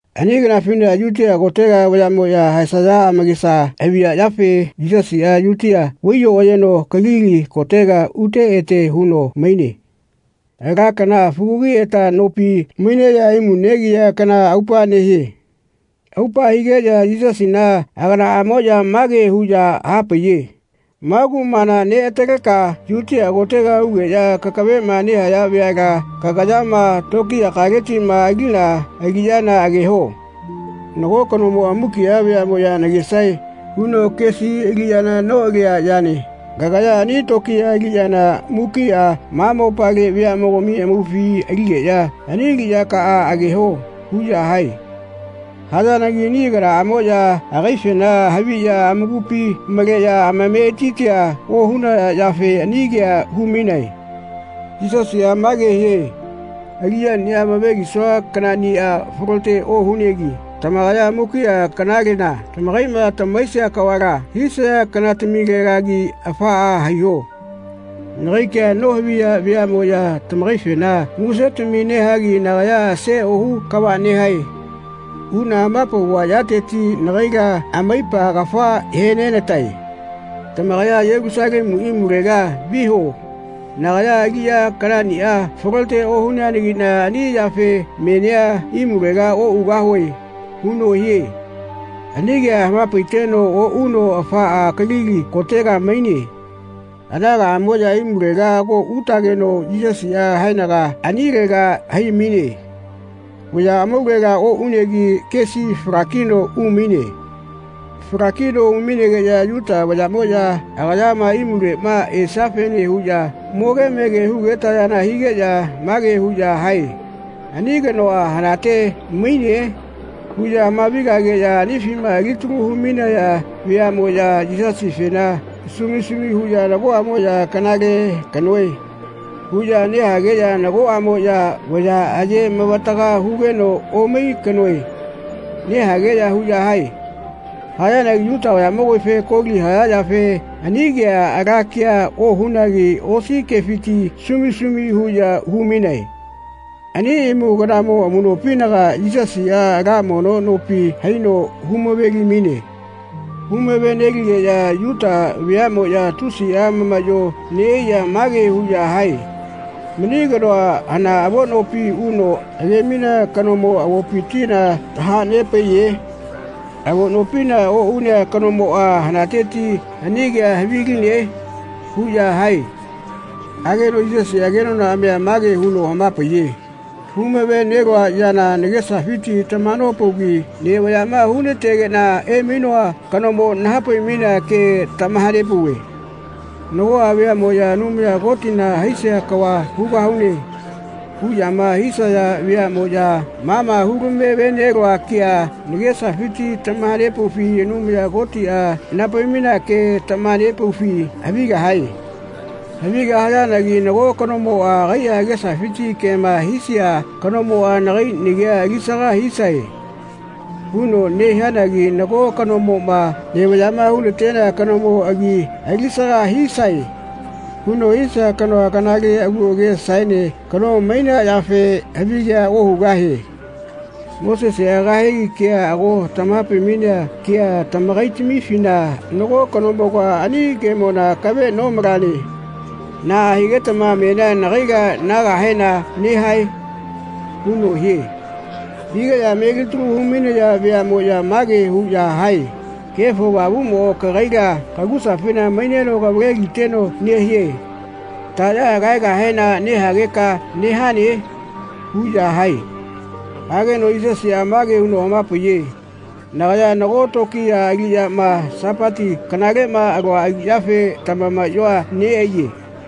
Ani kanafina Yutia kotega vayaꞌmoꞌya haesaya amakesa haviya yafe Yisasiꞌa Yutia vai-oꞌayeno Kalili kotega ute ete huno maine. Ala kana, fugagiꞌeta nopi maineꞌya imu negiya kana aupa nehie. Aupa higeꞌya Yisasina aganaꞌamoꞌya mage huꞌya hapaiye “Ma kumala neꞌataleka Yutia kotega ugeꞌya kakaveꞌma nehaya veala kagayama tokiyakaletiꞌma alina aliꞌyana ageho. Nago kanomoꞌa ‘Mukiꞌa veaꞌmoꞌya nagesae.’ huno kesi aliꞌyana noꞌalia yane. Kagaya ani tokiya aliꞌyana mukiꞌa ma mopale veaꞌmogami amaufi aligeꞌya ani aliꞌyakaꞌa ageho.” huꞌya hae. Hayanagi ani aganaꞌamoꞌya agaifena haviꞌya amakupi maleꞌya amametitia ohunaya yafe ani kea hu-mainae. Yisasiꞌa mage hie “Aliꞌyaniꞌa amave-lisua kanaꞌniꞌa falote ohunegi tamakaya mukiꞌa kanalela tamakaiꞌma tamahaisia kavala hisaya kanatamilelagi afaꞌa haiho. Nagai ke nohaviya veaꞌmoꞌya tamakaifena musetami nehagi nagaya ‘Ase ohu kava nehae.’ huꞌna hama-pauva yateti nagaila amaipa kafa he-nenatae. Tamakaya Yelusalemu imulega viho. Nagaya aliꞌya kanaꞌniꞌa falote ohuneanagiꞌna ani yafe menia imulega oꞌugahue.” huno hie. Ani kea hama-paiteno oꞌuno afaꞌa Kalili kotega maine. Aganaꞌamoꞌya imulega ago utageno Yisasiꞌa haenaga anilega hai-maine. Vaya amaulela oꞌunegi kesi fala-kino umaine. Falakino umainegeꞌya Yuta vayaꞌmoꞌya agayama imuleꞌma esiafene huꞌya moge mege hugetayana higeꞌya mage huꞌya hae “Ani kanoa hanate maine?” huꞌya hamavi-gageꞌya anifima alitalu hu-mainaya veaꞌmoꞌya Yisasifena sumi sumi huꞌya nagoꞌamoꞌya “Kanale kanoe.” huꞌya nehageꞌya nagoꞌamoꞌya “Vaya aye-mavataga hugeno omai kanoe.” nehageꞌya huꞌya hae. Hayanagi Yuta vayaꞌmogamife koli haya yafe ani kea ala kea ohunagi osi kefiti sumi sumi huꞌya hu-mainae. Ani imu kanamo amuꞌnopinaga Yisasiꞌa ala mono nopi haino hu-mave-li-maine. Hu-mave-neligeꞌya Yuta veaꞌmoꞌya tusiꞌa amamaꞌyo neꞌaiꞌya mage huꞌya hae “Mani kanoa hana avo nopi uno age-mainea kanomo avopitila taha-nepaiye? Avo nopina oꞌunea kanomoꞌa hanateti ani kea haviline?” huꞌya hae. Hageno Yisasiꞌa kenonaꞌamia mage huno hama-paiye “Hu-mave-nelua yana nagesafiti tamaha-nopaugi nevaꞌyaꞌma hu-na-tegeꞌna emainoa kanomo naha-pai-mainea ke tamaha-nepauve. Nagoꞌa veaꞌmoꞌya ‘Anumaya Kotina haisia kava hugahune.’ huꞌyama hisaya veaꞌmoꞌya ma ma hu-lamave-nelua kea nagesafiti tamaha-nepaufi Anumaya Kotiꞌa naha-pai-mainea ke tamaha-nepaufi havigahae. Havigahayanagi nago kanomoꞌa agaiꞌa agesafiti kema hisia kanomoꞌa ‘Nagai nagi alisaga hisae.’ huno nehianagi nago kanomoꞌma ‘Nevaꞌyaꞌma hu-na-tenea kanomo agi alisaga hisae.’ huno hisia kanoa kanale agu agesaene kano mainea yafe havigea ohugahie. Moseseꞌa kahegi kea ago tamaha-pai-mainea ke tamakaitamifina nago kanomoga ani kemona akavela nomalane. Naꞌa higetama menia nagaila nahaegahena nehae?” huno hie. Higeꞌya melitalu hu-mainaya veaꞌmoꞌya mage huꞌya hae “Kefo avamuꞌmo kagaila kagusafina maineno kavale-liteno nehie. Taꞌya kahaegahena nehageka nehane?” huꞌya hae. Hageno Yisasiꞌa mage huno hama-paiye “Nagaya nago tokiya aliꞌyama Sapati kanaleꞌma alua aliꞌyafe tamamaꞌyoa neꞌaiye.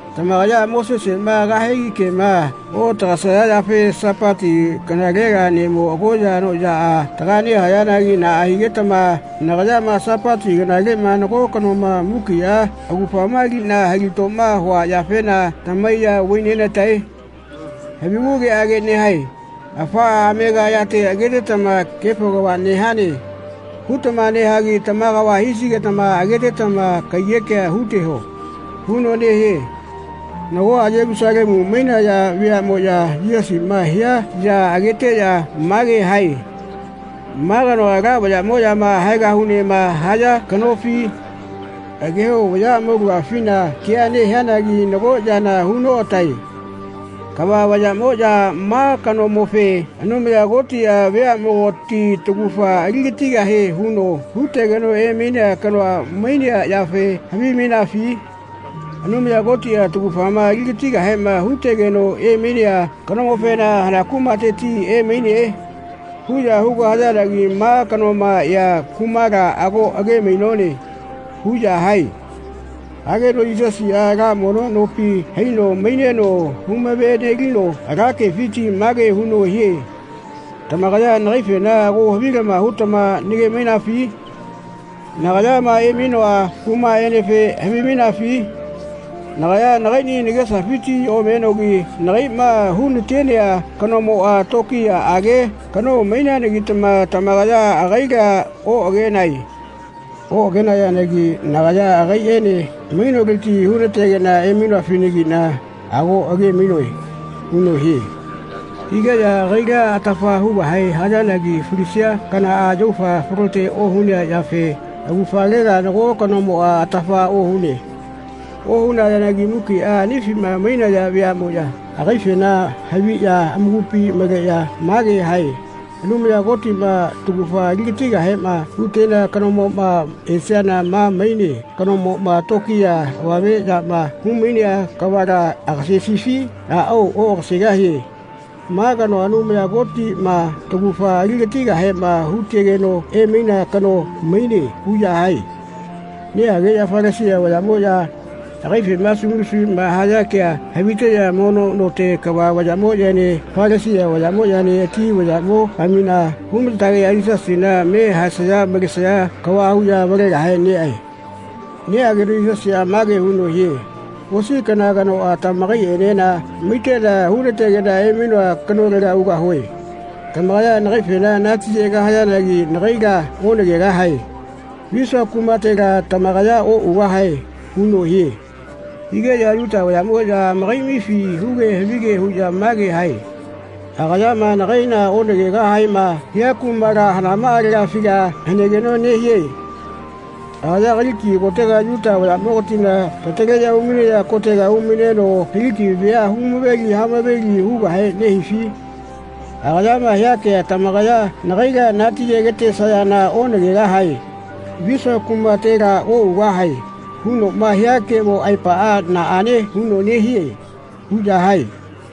Tamakaya Moseseꞌma kahegi kema oꞌatagaesaya yafe Sapati kanalela neꞌmo agoya anoꞌyaꞌa taga nehayanagi naꞌa higetama nagayama Sapati kanalema nago kanoma mukiꞌa augafama aliꞌna hilatoma hua yafena tamahaiya vai-nena-tae? Havigu ke nehae. Afaꞌa amega yate agetetama ‘Kefo kava nehane.’ hutama nehagi tama kava hisigetama agetetama kaiyekea hu-teho.” huno nehie. Nagoꞌa Yelusalemu mainaya veaꞌmoya Yisasiꞌma hia ya ageteꞌya mage hae “Ma kanoa ala vayaꞌmoꞌyama haegahunema haya kanofi? Ageho vaya amaulagafina kea nehianagi nago yana hu noꞌatae. Kava vayaꞌmoꞌya ma kanomofe Anumaya Kotiꞌa veaꞌmogati taugafa ali-gatigahie huno hu-tegeno emainea kanoa mainea yafe havimainafi? Anumaya Kotiꞌa taugafama ali-gatigahema hu-tegeno emainea kanomofena ‘Hana kumateti emaine?’ huꞌya hugahayanagi ma kanoma ea kumala ago age-mainone.” huꞌya hae. Hageno Yisasiꞌa ala mono nopi haino maineno hu-mave-nelino ala kefiti mage huno hie “Tamakaya nagaifena ago havilama hutama nage-mainafi? Nagayama emainoa kumaꞌenefe havimainafi? Nagaya nagaiꞌni nagesafiti omenogi nagaiꞌma hu-natenea kanomoꞌa tokiyaꞌage kano maineanagitama tamakaya agaila oꞌagenae. Oꞌagenayanagi nagaya agaiꞌene mainoleti hu-nategeꞌna emainoafenagiꞌna ago age-mainoe.” huno hie. Higeꞌya agaila atafa hugahe hayanagi falisia kanaꞌa yaufa falote ohunea yafe augafalela nago kanomoꞌa atafa ohune. Ohunayanagi mukiꞌa anifima mainaya veaꞌmoꞌya agaifena haviꞌya amakupi maleꞌya mage hae “Anumaya Kotiꞌma taugafa ali-gatigahema hu-tenea kanoma esiana ma mainea kanomoꞌma tokiya avame yama hu-mainea kavala agasesifi? Aꞌao oꞌagasegahie. Ma kanoa Anumaya Kotiꞌma taugafa ali-gatigahema hu-tegeno emainea kano maine.” huꞌya hae. Nehageꞌya Falasia vayaꞌmoꞌya agaifema sumi sumiꞌma haya kea haviteꞌya mono note kava vayaꞌene Falasia vayaꞌene ati vayaꞌmogamina hu-ma-tageꞌya Yisasina me haesaya malesaya kava huꞌya avalegahe neꞌae. Neꞌageno Yisasiꞌa mage huno hie “Osi kana kanoꞌa tamakaiꞌenena maiteꞌna hu-nategeꞌna emainoa kanolega ugahue. Tamakaya nagaifena natiyegahayanagi nagaila onagegahae. Visua kumatela tamakaya oꞌugahae.” huno hie. Higeꞌya Yuta vayaꞌmoꞌya amakaiꞌamifi huge havige huꞌya mage hae “Agayama ‘Nagaila onagegahaema.’ hia kumala hanamaꞌalegafiga hanegeno nehie? Agaya Kaliki kotega Yuta vayaꞌmogatina tataleꞌya umainaya kotega umaineno Kaliki vea hu-mave-li hamaveli hugahe nehifi? Agayama hia kea ‘Tamakaya nagaila natiyegetesayana onagegahae. Visua kumatela oꞌugahae.’ hunoꞌma hia kemo aepaꞌa naꞌane huno nehie?” huꞌya hae.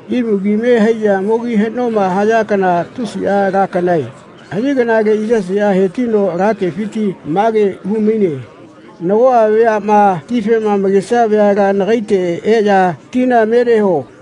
Imu kime haiꞌya mogi haꞌnoma haya kana tusiꞌa ala kanae. Ani kanale Yisasiꞌa he-tino ala kefiti mage hu-maine “Nagoꞌa veaꞌma tifema amakesia veala nagaite eꞌya tina me neho.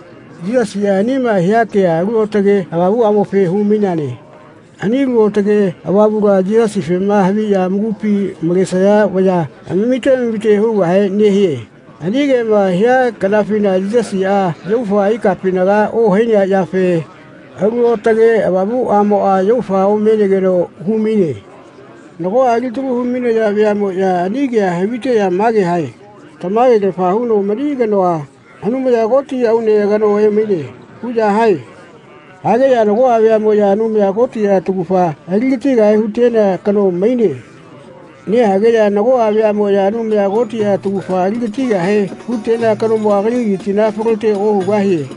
Yisasiꞌa anima hia kea “Alu Aotage Avamuꞌamofe hu-maine.” Ani Alu Aotage Avamula Yisasifema haviꞌya amakupi malesaya vaya amamite amamite hugahe nehie. Ani kema hia kanafina Yisasiꞌa yaufa ikapinaga ohainea yafe Alu Aotage Avamuꞌamoꞌa yaufa omenegeno hu-maine. Nagoꞌa alitalu hu-mainaya veaꞌmoya ani kea haviteꞌya mage hae “Tamage-lafa huno mani kanoa Anumaya Koti aune kano emaine.” huꞌya hae. Hageꞌya nagoꞌa veaꞌmoꞌya “Anumaya Kotiꞌa taugafa ali-gatigahe hu-tenea kano maine.” nehageꞌya nagoꞌa veaꞌmoꞌya “Anumaya Kotiꞌa taugafa ali-gatigahe hu-tenea kanomoꞌa Kalilitila falote ohugahie.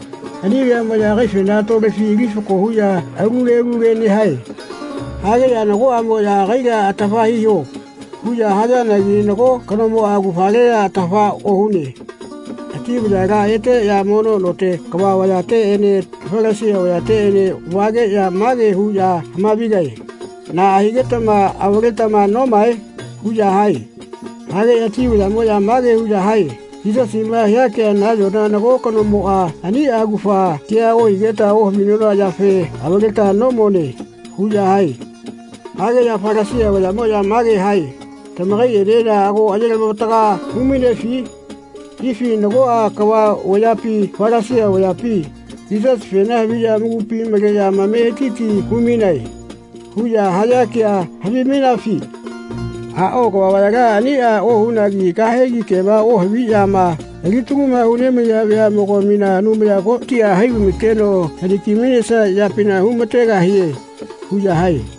Ani veaꞌmoꞌya agaifena tolefi ali fako huꞌya alu ke alu ke nehae. Hageꞌya nagoꞌamoꞌya “Agaila atafa hiho.” huꞌya hayanagi nago kanomoꞌa augafalela atafa ohune. Ati vayala eteꞌya mono note kava vayateꞌene Falasia vayateꞌene vageꞌya mage huꞌya hamavigae “Naꞌa higetama avaletama nomae?” huꞌya hae. Hageꞌya ati vayaꞌmoꞌya mage huꞌya hae “Yisasiꞌma hia kea nayona nago kanoꞌmoꞌa aniꞌa augafa kea ohigeta ohavinona yafe avaleta nomone.” huꞌya hae. Hageꞌya Falasia vayaꞌmoꞌya mage hae “Tamakaiꞌenena ago aye-lamavataga hu-mainefi? Ifi nagoꞌa kava vayapi Falasia vayapi ‘Yisasifena haviꞌya amakupi maleꞌya amameti hu-mainae.’ huꞌya haya kea havimainafi? Aꞌao kava vayala aniꞌa ohunagi kahegi kema ohaviꞌyama alitaluma hu nemaiya veaꞌmogamina Anumaya Kotiꞌa hai vai-ma-teno haniki-mainesia yapina hu-mategahie.” huꞌya hae.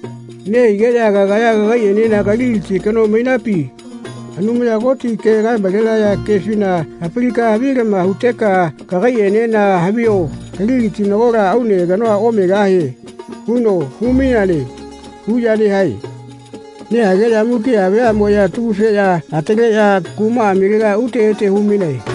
Nehigeꞌya “Kagaya kagaiꞌenena Kaliliti kano mainapi? Anumaya Koti ke kae-malenaya kefina hapalika havilama huteka kagaiꞌenena havio Kaliliti nagola aune kano omegahie.” huno hu-maineane huꞌya nehae. Nehageꞌya mukiꞌa veaꞌmoꞌya atagu-feꞌya ataleꞌya kumaꞌamilega ute ete hu-mainae.